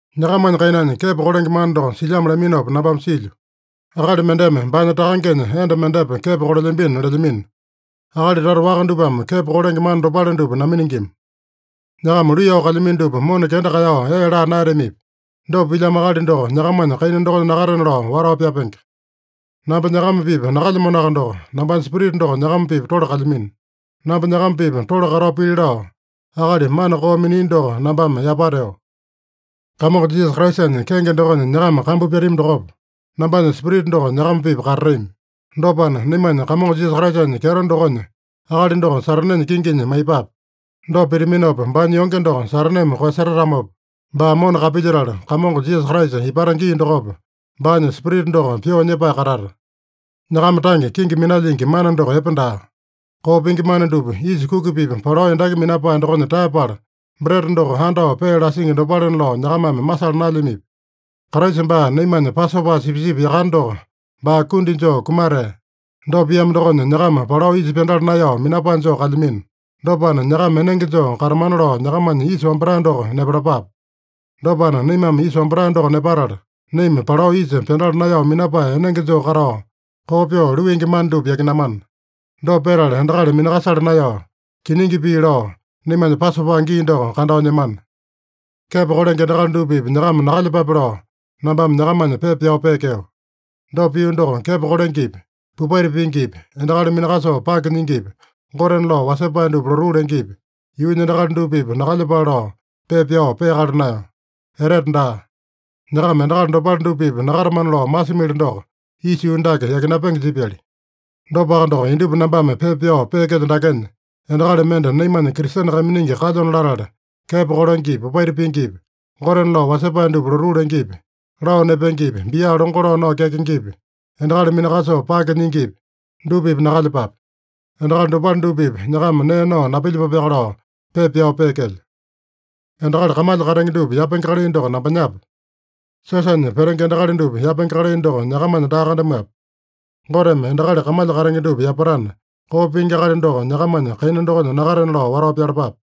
Nyakamanya kainanya kepo kolenge mana doko silyamo laminopa nambame silyo. Akali mendeme baanya takangenya enda mendepa kepo kolelyambino lelyamino. Akali tata waka dupame kepo kolenge mana dopale dupa naminingima. Nyakama luiyao kalyamino dupa mona kenda kaeyao ee laa naeyatamipi? Dopa pilyamo akali doko nyakamanya kaina dokonya nakatena lao watao pyapenge. Namba nyakama-pipa nakalyamanoaka doko, nambanya spirita doko nyakama-pipa tole kalyamino. Namba nyakama-pipa tole katao pili lao, akali mana koo minia doko nambame yapateo. Kamongo Jisasa Kraisanya kenge dokonya nyakama kambu pyatami dokopa, nambanya spirita doko nyakama-pipa katatami. Dopana, naimanya Kamongo Jisasa Kraisanya kyeto dokonya akali doko Satanenya kinginya maiyepape. Dopa pitaminopa, baanya yonge doko Sataneme koeyasetatamopa, baa mona kapilyetala, Kamongo Jisasa ipata gii dokopa, baanya spirita doko pyoo nyepae katata. Nyakama tange kenge minalyingi mana doko epe daa. Koo pingi mana dupa, yisa kuki-pipa palao endaki minapae dokonya taeyapala, breta doko andao pee lasingi dopalena lao nyakamame masala naelyamipi? Kraisa baa naimanya Pasopa sipisipi yakane doko baa kundi joo kumatea. Dopa piamo dokonya, nyakama palao yisa pyandala naeyao minapae joo kalyamino. Dopana, nyakama enenge joo katamana lao nyakamanya yisa wambatae doko nepalapape. Dopana, naimame yisa wambatae doko nepatala, naima palao yisa pyandala naeyao minapae enenge joo katao, koo pyoo luingi mana dupa yakinamana. Dopa petala, endakali minakasala naeyao, kiningi pii lao, naimanya Pasopa gii doko kandao nyemana. Kepo kolenge endakali dupa-pipa nyakama nakalyepape lao, nambame nyakamanya pepa pyao peekeo. Dopa pio doko, kepo kolengepi, popaita pingipi, endakali minakasoo pake nyingipi, gotena lao wasepae dupa lotuu lengepi, yuunya endakali dupa-pipa nakalyepale lao pepa pyao peakala naeyo. Etete daa. Nyakama endakali dopale dupa-pipa nakatamana lao masimili doko, isa yuu dake yakinapenge jipyali. Dopaka doko, indupa nambame pepa pyao peekelyo dakenya, endakali mende naimanya Kristene kaiminingi kalyona latala, kepo kolengepi, popaita pingipi, gotena lao wasepae dupa lotuu lengepi, lao nepengepi, bia longo lao nao kyakengepi, endakali minakasoo pake nyingipi, dupa-pipa nakalyepape. Endakali dopale dupa-pipa nyakama nee nao napilyepapeaka lao pepa pyao peekelyo. Endakali kamalya katenge dupa yapenge kalai doko nambanyape? Siosanya petenge endakali dupa yapapenge kalai doko nyakamanya daa kandamuape? Goteme endakali kamalya katenge dupa yapatana, koo pingi akali doko nyakamanya kaina dokonya nakatena lao watao pyalapape.